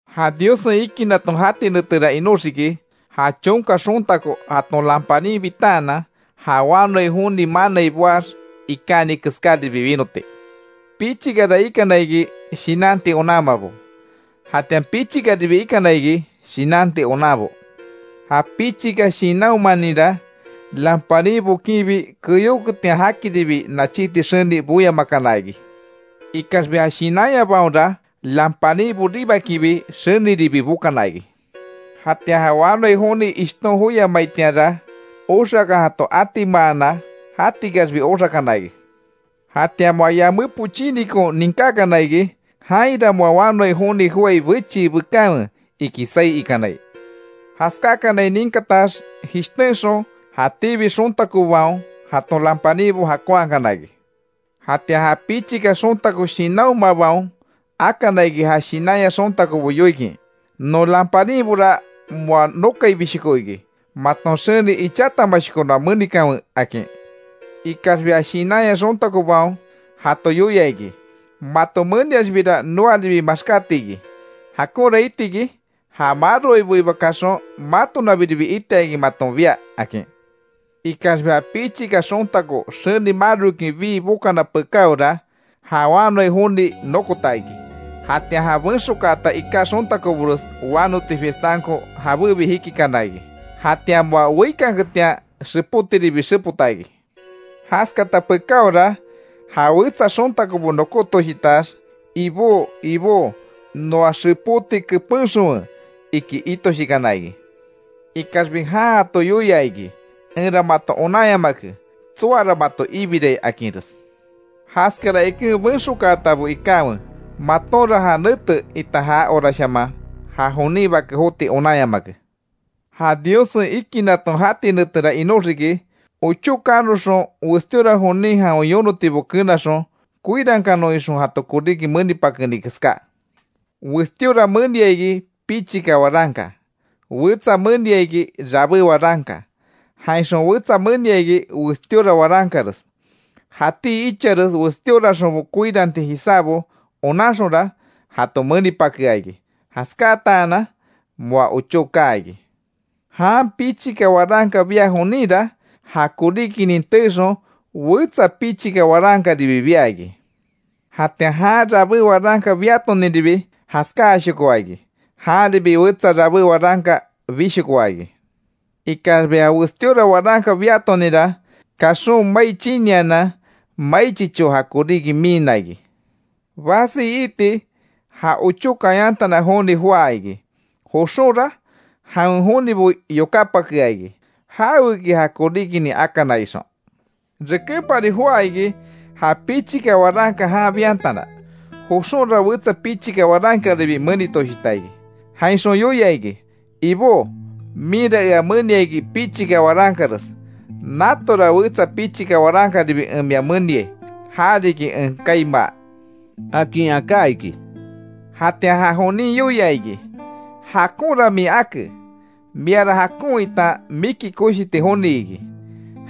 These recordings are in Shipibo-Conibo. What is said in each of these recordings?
Ja Diossen ikinaton jati netera inoxiki, ja chonka xontako jaton lamparin bitaanan ja wanoai joni manai boax ikáni keskáribi winoti. Pichikara ikana iki, shinanti onanmabo, jatian pichikaribi ikana iki shinanti onanbo. Ja pichika shinanhomaninra, lamparin bokinbi, keyóketian jakiribi nachíti xeni boyamakana iki. Ikaxbi ja shinanyabaonra, lamparin boribakinbi, xeniribi bokana iki. Jatian ja wanoai joni ishton joyamaitianra, oxakan jato atimaana, jatikaxbi oxakana iki. Jatian moa yamé pochínikon ninkákana iki: ‘¡Jainra moa wanoai joni joái bechii bekanwe!’ iki saí ikanai. Jaskákanai ninkatax jishtenxon, jatíbi xontakobaon jaton lamparinbo jakonhakana iki. Jatian ja pichika xontako shinanhomabaon akana iki ja shinanya xontakobo yoikin: ‘Non lamparinbora moa nokaibishoko iki, maton xeni ichatamashoko noa menikanwe’, akin. Ikaxbi ja shinanya xontakobaon jato yoia iki: ‘Mato meniaxbira noaribi maxkátiki, jakonra itiki, ja maroaiboiba kaxon matonabiribi itiakin maton biá’, akin. Ikaxbi ja pichika xontako xeni marokin bii bokana pekáora, ja wanoai joni nokota iki. Jatian ja benxokaata iká xontakobores wanoti fiestanko jabébi jikikana iki. Jatian moa weíkanketian xepótiribi xepota iki. Jaskata pekáora ja wetsa xontakobo nokótoshitax, ‘¡Ibó! ¡Ibó! Noa xepóti kepenxonwe’, iki itoshikana iki. Ikaxbi jan jato yoia iki: ‘Enra mato onanyamake, tsoara mato ibirai akinres’. Jaskara iken; benxokaatabo ikanwe. Matonra ja nete itan ja horashaman ja jonin Bake jotiki onanyamake. Ja Diossen ikinaton jati netera inoxiki, ochó kanoxon westíora jonin jawen yonotibo kenaxon koirankanon ixon jato koríki menipakeni keská. Westíora menia iki, pichika waranka, wetsa menia iki, rabé waranka; jainxon wetsa menia iki westíora warankares. Jatí ichares westíoraxonbo koirankanti jisábo onanxonra jato menipakea iki. Jaskáatanan moa ochó kaa iki. Jan pichika waranka bia joninra, ja koríkinin teexon wesa pichika warankaribi bia iki. Jatian jan rabé waranka biatoninribi jaskáashokoa iki. Janribi wetsa rabé waranka bishokoa iki. Ikaxbi ja westíora waranka biatoninra, kaxon mai chinianan mai chicho ja koríki miinna iki. Basi iiti ja ochó kayantana joni joá iki. Joxonra jawen jonibo yokápakea iki, jaweki ja koríkinin akana ixon. Rekempari joá iki ja pichika waranka jan biantana, joxonra wetsa pichika warankaribi menitoshita iki. Jainxon yoia iki: ‘Ibó, minra ea menia iki pichika warankares, natora wetsa pichika warankaribi en mia meniai, ja riki en kaimaa’, akin aká iki. Jatian ja jonin yoia iki: ‘Jakonra min ake, miara jakon itan miki koshiti joni iki,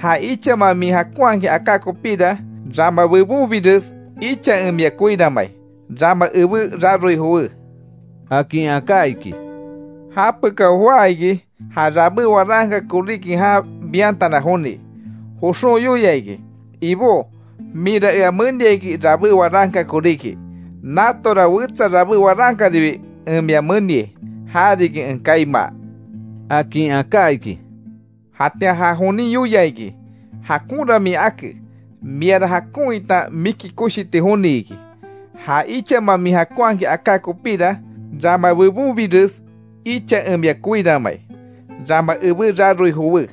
ja ichama min jakonhakin aká kopíra, rama bebonbires icha en mia koiranmai. Rama ebé raroi jowé’, akin aká iki. Ja pekao, joá iki ja rabé waranka koríki jan biantana joni, joxon yoia iki: ‘Ibó minra ea menia iki rabé waranka koríki, natora wetsa rabé warankaribi en mia meniai, ja riki en kaimaa’, akin aká iki. Jatian ja jonin yoia iki: ‘Jakonra min ake, miara jakon itan miki koshiti joni iki, ja ichama min jakonhakin aká kopíra, rama bebonbires icha en mia koiranmai. Rama ebé raroi jowé’,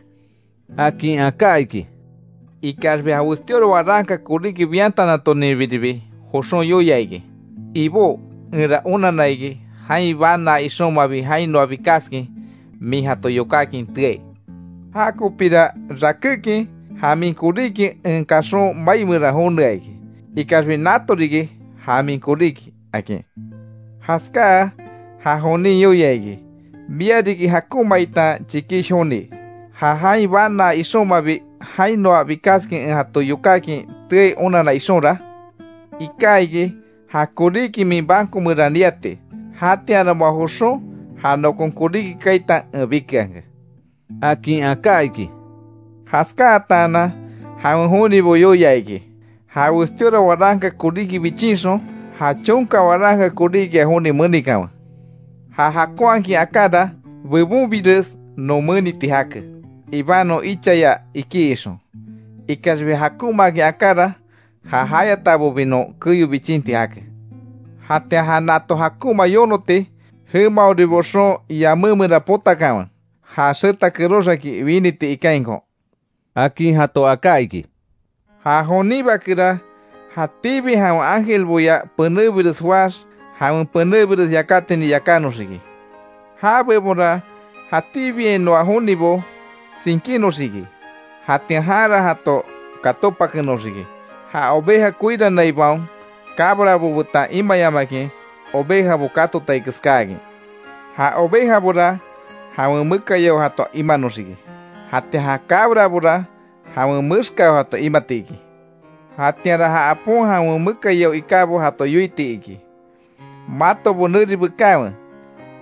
akin aká iki. Ikaxbi ja westíora waranka koríki biantana toninbiribi joxon yoia iki: ‘Ibó, enra onanna iki, jain banaa ixonmabi jainoa bikaskin min jato yokákin teai. Ja kopira, rakékin ja min koríki en kaxon mai meran jonea iki. Ikaxbi nato riki ja min koríki’, akin. Jaskáa, ja jonin yoia iki: ‘Mia riki jakonma, itan chikish joni. Ja jain banaa ixonmabi jainoa bikaskin en jato yokákin teai onanna ixonra, iká iki, ja koríki min banco meran niati. Jatianra moa joxon ja nokon koríki kaita en bikeanke’, akin aká iki. Jaskáatanan jawen jonibo yoia iki: ‘Ja westíora waranka koríki bichinxon, ja chonka waranka koríkia joni menikanwe. Ja jakonhakin akára, bebonbires non meniti jake ibanon ichaya iki ixon. Ikaxbi ja jakonmaakin akára, ja jayatabobi non keyo bichinti jake. Jatian ja nato jakonma yonoti, jemaori boxon yamé meran potakanwe, ja xeta kerox aki winiti ikainko’, akin jato aká iki. Ja jonin Bakera, jatíbi jawen ángelboya penébires joáx, jawen penébires yakátinin yakánoxiki. Já bebonra jatíbiainoa jonibo tsinkinoxiki. Jatian janra jato katópakenoxiki, ja oveja koiranaibaon cabrabo betan imayamakin ovejabo katotai keskáakin. Ja ovejabora jawen mekayao jato imanoxiki, jatian ja cabrabora jawen mexkao jato imati iki. Jatianra ja apon jawen mekayao ikábo jato yoiti iki: ‘Matobo neri bekanwe,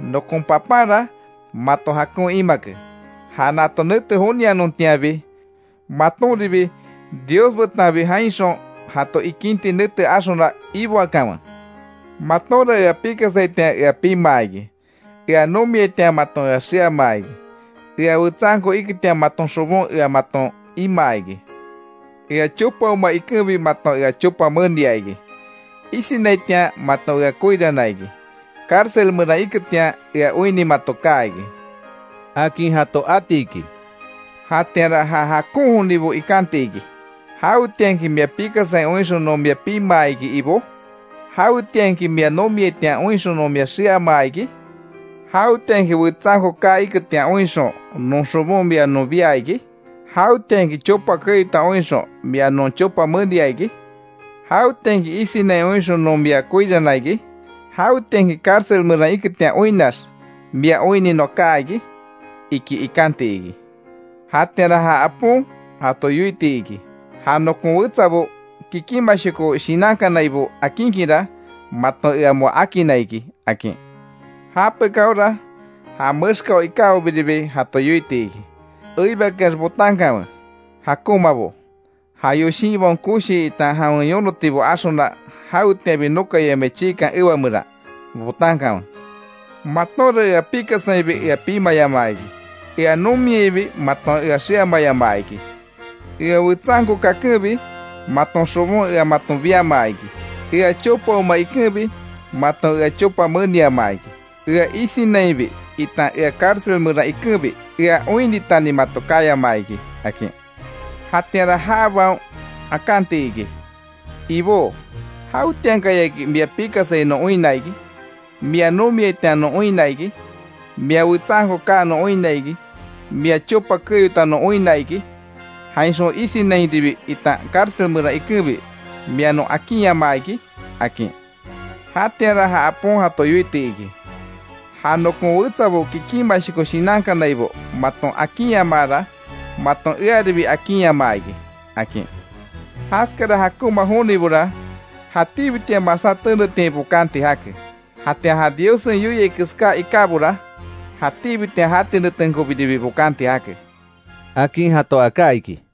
nokon Papanra mato jakon imake. Ja nato nete jonianontianbi, matonribi Dios betanbi jainxon jato ikinti nete axona, iboakanwe. Matonra ea pikasaitian ea pimaa iki. Ea nomiaitian maton ea xeamaa iki. Ea wetsanko iketian maton xobon ea maton imaa iki. Ea chopaoma ikenbi maton ea chopa menia iki. Isinaitian, maton ea koirana iki. Cárcel meran iketian, ea oinni mato kaa iki’, akin jato atiki. Jatianra ja jakon jonibo ikanti iki: ‘¿Jawetianki, mia pikasai oinxon non mia pimaa iki, Ibó? ¿Jawetianki, mia nomiaitian oinxon non mia xeamaa iki? ¿Jawetianki wetsanko kaa iketian oinxon, non xobon mia non bia iki? ¿Jawetianki chopa keyota oinxon, mia non chopa menia iki? ¿Jawetianki, isinai oinxon non mia koirana iki? ¿Jawetianki, cárcel meran iketian oinnax mia oinni noa kaa iki?’ iki ikanti iki. Jatianra, ja Apon jato yoiti iki: ‘Ja nokon wetsabo, kikinmashoko shinankanaibo akinkinra, maton ea moa akinna iki’, akin. Japekáora, ja mexkao ikábobiribi jato yoiti iki: ‘¡Eibakeax botankanwe, jakonmabo. Ja yoshinbaon koshi itan jawen yonotibo axona, jawetianbi nokayamai chiikan ewa meran botankanwe! Matonra ea pikasainbi ea pimayamaa iki. Ea nomiainbi maton ea xeamayamaa iki. Ea wetsanko kakenbi, maton xobon ea maton biamaa iki. Ea chopaoma ikenbi, maton ea chopa meniamaa iki. Ea isinainbi itan ea cárcel meran ikenbi, ea oinnitani mato kayamaa iki’, akin. Jatianra jabaon akanti iki: ‘Ibó, ¿Jawetiankayaki mia pikasai non oinna iki, mia nomiaitian non oinna iki, mia wetsanko kaa non oinna iki, mia chopa keyota non oinna iki, jainxon isinainbi itan cárcel meran ikenbi mia non akinyamaa iki?’ akin. Jatianra, ja apon jato yoiti iki: ‘Ja nokon wetsabo, kikinmashoko shinankanaibo maton akinyamaara, maton earibi akinyamaa iki’, akin. Jaskara jakonma jonibora, jatíbitian masá tenetiain bokanti jake. Jatian ja Diossen yoiai keská ikábora jatíbitian jati netenkobiribi bokanti jake —akin jato aká iki.